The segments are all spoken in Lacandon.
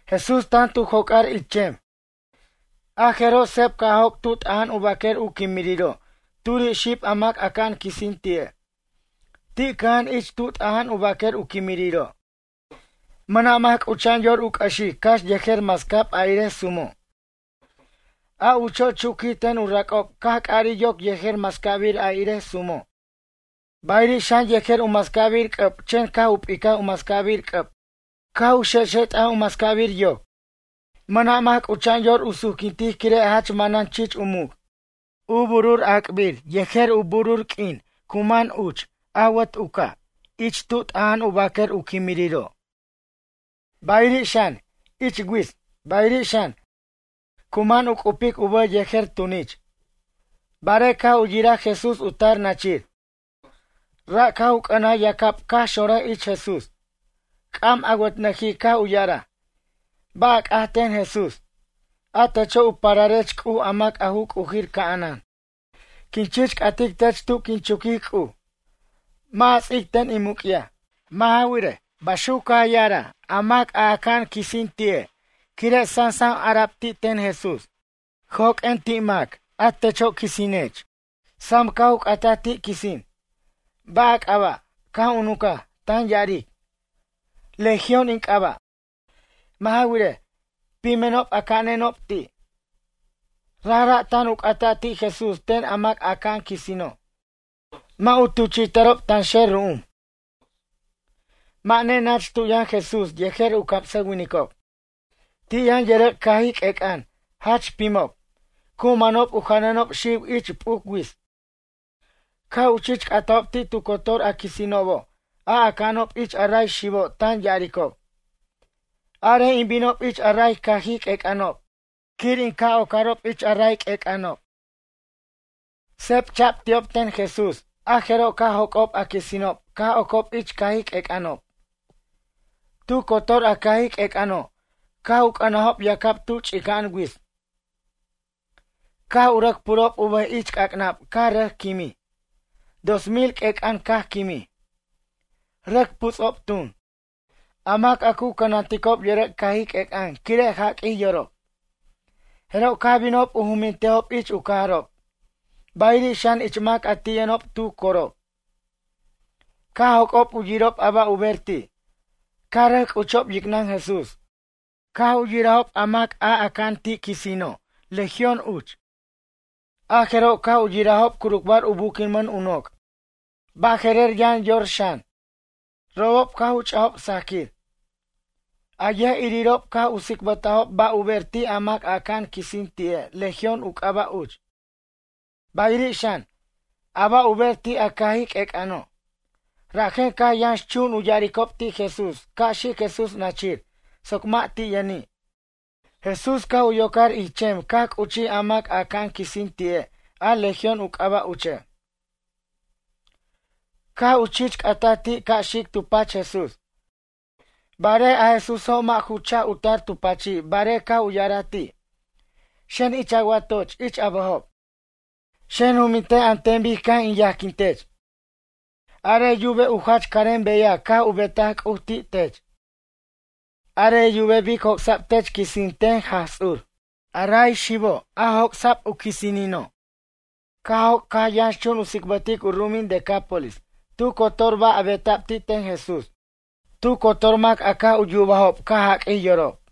Jesús tan tu joc'ar ich chem, a jeroj seb caj joc' tu t'aja'an u baquer u quimiriro' turiri' xib a mac aca'an quisin ti'e'. Ti' cʌja'an ich tu t'aja'an u baquer u quimiriro'. Mʌna' mac c'ucha'an yor u c'ʌxic cax yejer mascab a irej sumo'. A ucho' chuquij ten u rac'ob caj c'ʌrij yoc yejer mascabir a irej sumo', bayiri' xan yejer u mascabir c'ʌb chen caj u p'icaj u mascabir c'ʌb caj u xexet'aj u mascabir yoc. Mʌna' mac c'ucha'an yor u suquintic quire' jach manan chich u muc'. U burur ac'bir yejer u burur q'uin cu man uch awʌt u ca' ich tu t'aja'an u baquer u quimiriro', bayiri' xan, ich wits, bayiri' xan, cu man u c'ubic u bʌj yejer tunich. Barej caj u yiraj Jesús u tar nachir, ra' caj u c'ʌnaj yacab caj xonraj ich Jesús. C'am awʌtnʌjij caj u ya'araj: ―Ba' a c'at ten Jesús? A techo' u pararech C'uj a mac u C'ujir ca'anan. Quin chich c'atic tech tu quin chuquic C'uj, mʌ' a ts'ic ten in muc'yaj. Mʌ' ja wirej, baxuc caj ya'araj a mac a aca'an quisin ti'e' quire' sam ara'b ti' ten Jesús: ―Joq'uen ti' a maca' a techo' quisinech. Sam caj u c'ataj ti' quisin: ―Ba' a c'aba'? Caj u nuncaj, tan ya'aric: ―Legión in c'aba'. Mʌ' ja wirej, pimenob aca'anenob ti'. Rajra' tan u c'ata' ti' Jesús ten a mac a aca'an quisino' mʌ' u tuchi'ta'rob tanxer ru'um. Mʌ' nenach tu yʌn Jesús yejer u camsʌwinicob, ti' yʌn yʌrʌc' cajij q'uec'ʌn, jach pimob. Cu manob u janʌnob xiw ich p'uc wits. Caj u chich c'atajob ti' tu cotor a quisinobo' a aca'anob ich a ray xibo' tan ya'aricob: ―Arej in binob ich a ray cajij q'uec'ʌnob quir in ca' wocarob ich a ray q'uec'ʌnob. Seb cha'b ti'ob ten Jesús, a jeroj caj joc'ob a quisinob caj ocob ich cajij q'uec'ʌnob. Tu cotor a cajij q'uec'ʌno' caj u c'ʌnajob yacab tu ch'inca'an wits caj u rʌc purob u bʌj ich c'ac'nab caj rʌc quimij. Dos mil q'uec'ʌn caj quimij. Rʌc puts'ob tun, a mac a cu cʌnanticob yʌrʌc' cajij q'uec'ʌn quire' jaquij yorob. Jeroj caj binob u jumintejob ich u cajarob, bayiri' xan ich mac a ti' yʌnob tu corob. Caj joc'ob u yirob a ba' u ber ti'. Caj rʌc c'uchob yicnʌn Jesús. Caj u yirajob a mac a aca'an ti' a quisino' Legión uch, a jeroj caj u yirajob curucbar u buquinmʌn u noc', baje'rer yʌn yor xan, robob caj u ch'ajob sajquir. A yʌj'irirob caj u tsicbʌtajob ba' u ber ti' a mac a aca'an quisin ti'e' Legión u c'aba' uch, bayiri' xan, a ba' u ber ti' a cajij q'uec'ʌno'. Rajen caj yʌnxchun u ya'aricob ti' Jesús ca' xic Jesús nachir soc mʌ' ti' yʌni'. Jesús caj u yocar ich chem caj c'uchij a mac a aca'an quisin ti'e' a Legión u c'aba' uche', caj u chich c'ataj ti' ca' xic tu pach Jesús. Barej a Jesúso' mʌ' ju chaj u tar tu pachi' barej caj u ya'araj ti': ―Xen ich a watoch ich a bʌjob. Xen jumintej an ten bic caj in yajquin tech. Arej yubej u jach carem beyaj caj u betaj C'uj ti' tech. Arej yubej bic joc'sa'b tech quisin ten Jaj Ts'ur. A ray xibo' a joc'sa'b u quisinino' caj joc' caj yʌnxchun u tsicbʌtic u ru'umin Decápolis tu cotor ba' a beta'b ti' ten Jesús. Tu cotor mac a caj u yubajob caj jaq'uij yorob.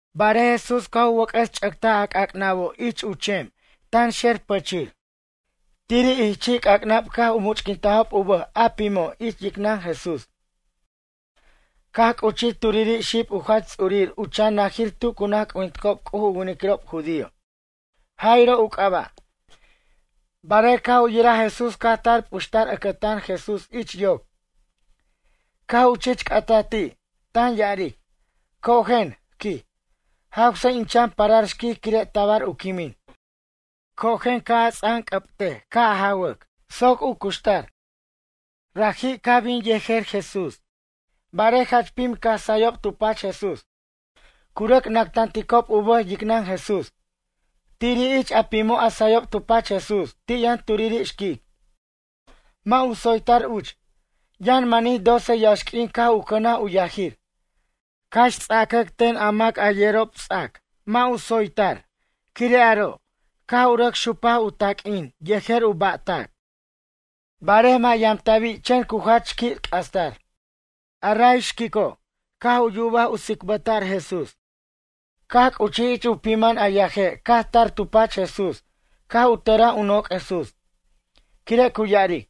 Barej Jesús caj u wʌc'ʌs ch'ʌctaj a c'ac'nabo' ich chem tanxer pichir. Tiri' ich chi' c'ac'nab caj u much'quintajob u bʌj a pimo' ich yicnʌn Jesús. Caj c'uchij turiri' xib u jach ts'urir u chan najir tu cu naj c'ujinticob C'uj u winiquirob judío, Jairo u c'aba'. Barej caj u yiraj Jesús caj tar p'uxtar ʌcʌtan Jesús ich yoc. Caj u chich c'ataj ti', tan ya'aric: ―Cojen ―quij―, jawsej in chan parar xquic quire' tabar u quimin. Cojen ca' a ts'anc'ʌbtej ca' jawac, soc u cuxtar. Caj bin Jesús yejer raji', barej jach pim caj sayob tu pach Jesús, cu rʌc nactanticob u bʌj yicnʌn Jesús. Tiri' ich a pimo' a sayob tu pach Jesús ti' yʌn turiri' xquic. Mʌ' u tsoytar uch. Yʌn manij doce yaxq'uin caj u cʌnaj u yajir. Cax ts'acʌc ten a mac a yerob ts'ac mʌ' u tsoytar quire' aro' caj u rʌc xupaj u taq'uin yejer u ba'tac, barej mʌ' yamta'bi' chen cu jach qui' c'astar. A ray xquico' caj u yubaj tsicbʌta'r Jesús. Caj c'uchij ich u pimʌn a yaje' caj tar tu pach Jesús caj u tʌraj u noc' Jesús. Quire' cu ya'aric: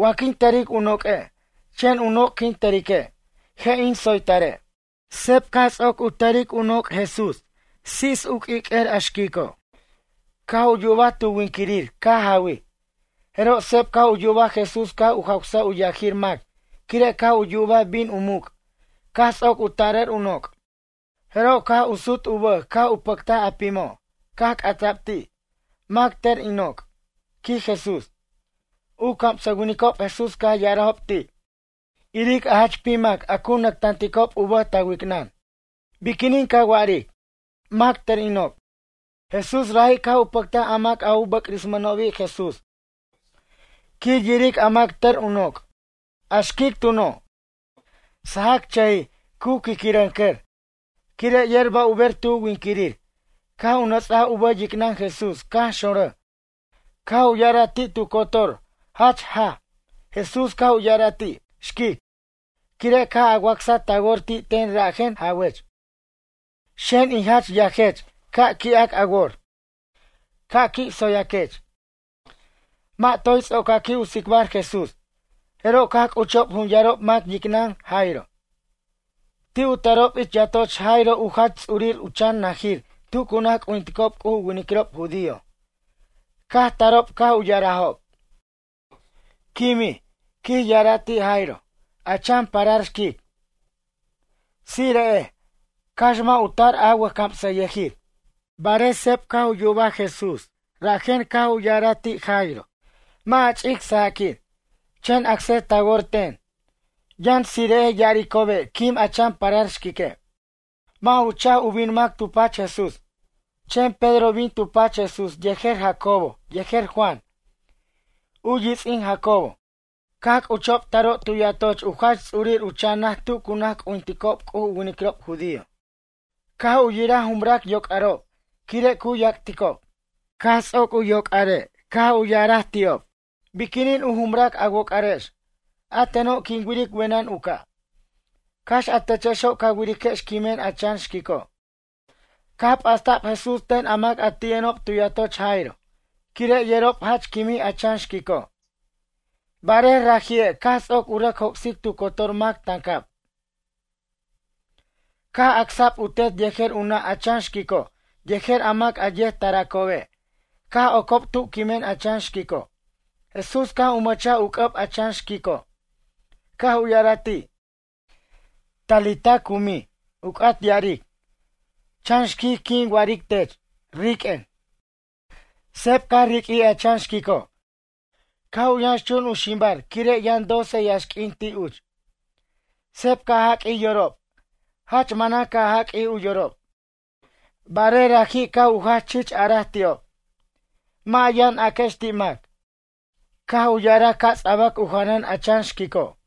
―Wa quin tʌric u noq'ue', chen u noc' quin tʌrique', je' in tsoytare'. Seb caj ts'oc u tʌric u noc' Jesús tsits u q'uiq'uer a xquico', caj u yubaj tu winquirir caj jawij. Jeroj seb caj u yubaj Jesús caj u jawsaj u yajir mac quire' caj u yubaj u bin u muc' caj ts'oc u tarʌr u noc'. Jeroj caj u sut u bʌj caj u pʌctaj a pimo', caj c'ata'b ti': ―Mac, tʌr in noc'? ―quij Jesús. U camsʌwinicob Jesús caj u ya'arajob ti': ―Iric a jach pim mac a cu nactanticob u bʌj ta wicnʌn, biquinin ca wa'aric: “Mac tʌr in noc'?” Jesús raji' caj u pʌctaj a mac a u bʌc'rismʌnobi' Jesús quir yiric a mac tʌr u noc'. A xquic tuno', sajacchʌjij cu quiquirʌncʌr quire' yer ba' u ber tu winquirir caj u nʌts'aj u bʌj yicnʌn Jesús caj xonrʌj caj u ya'araj ti' tu cotor jach jaj. Jesús caj u ya'araj ti': ―Xquic, quire' caj a wacsaj ta wor ti' ten rajen jawech. Xen in jach yajech ca' qui'ac a wor. Ca' qui' tsoyaquech. Mʌ' toy ts'ocaqui' u tsicbar Jesús, jeroj caj c'uchob jun yarob mac yicnʌn Jairo, ti' u tarob ich yatoch Jairo u jach ts'urir u chan najir tu cu naj c'ujinticob C'uj u winiquirob judío, caj tarob caj u ya'arajob: ―Quimij ―quij ya'ara' ti' Jairo― a chan parar xquic. Tsire'ej, cax mʌ' u tar a wʌjcamsayʌjir. Barej seb caj u yubaj Jesús rajen caj u ya'araj ti' Jairo: ―Mʌ' a ch'ic sajaquir, chen acsej ta wor ten. Yʌn tsire'ej ya'aricobe' quim a chan parar xquique'. Mʌ' ju chaj u bin mac tu pach Jesús, chen Pedro bin tu pach Jesús yejer Jacobo yejer Juan, u yits'in Jacobo. Caj c'uchob taro' tu yatoch u jach ts'urir u chan naj tu cu naj c'ujinticob C'uj u winiquirob judío caj u yiraj jumrac yoc'arob quire' cu yac'ticob. Caj ts'oc u yocare' caj u ya'araj ti'ob: ―Biquinin a jumrac a woc'arex? A teno' quin wiric wenʌn u ca', cax a techexo' ca wiriquex quimen a chan xquico'. Caj p'asta'b Jesús ten a mac a ti' yʌnob tu yatoch Jairo quire' yerob jach quimij a chan xquico'. Barej raji'e' caj ts'oc u rʌc joc'sic tu cotor mac tancab, caj acsa'b u tet yejer u nʌ' a chan xquico' yejer a mac a yet taracobe' caj ocob tu quimen a chan xquico'. Jesús caj u mʌchaj u c'ʌb a chan xquico' caj u ya'araj ti': ―Talita cumi ―u c'at ya'aric: Chan xquic quin wa'aric tech, riq'uen. Seb caj riq'uij a chan xquico', caj yʌnxchun u ximbar quire' yʌn doce yaxq'uin ti' uch. Seb caj jaq'uij yorob, jach manan caj jaq'uij u yorob. Barej raji' caj u jach chich araj ti'ob: ―Mʌ' a yʌn aquex ti' mac. Caj u ya'araj ca' ts'abac u janʌn a chan xquico'.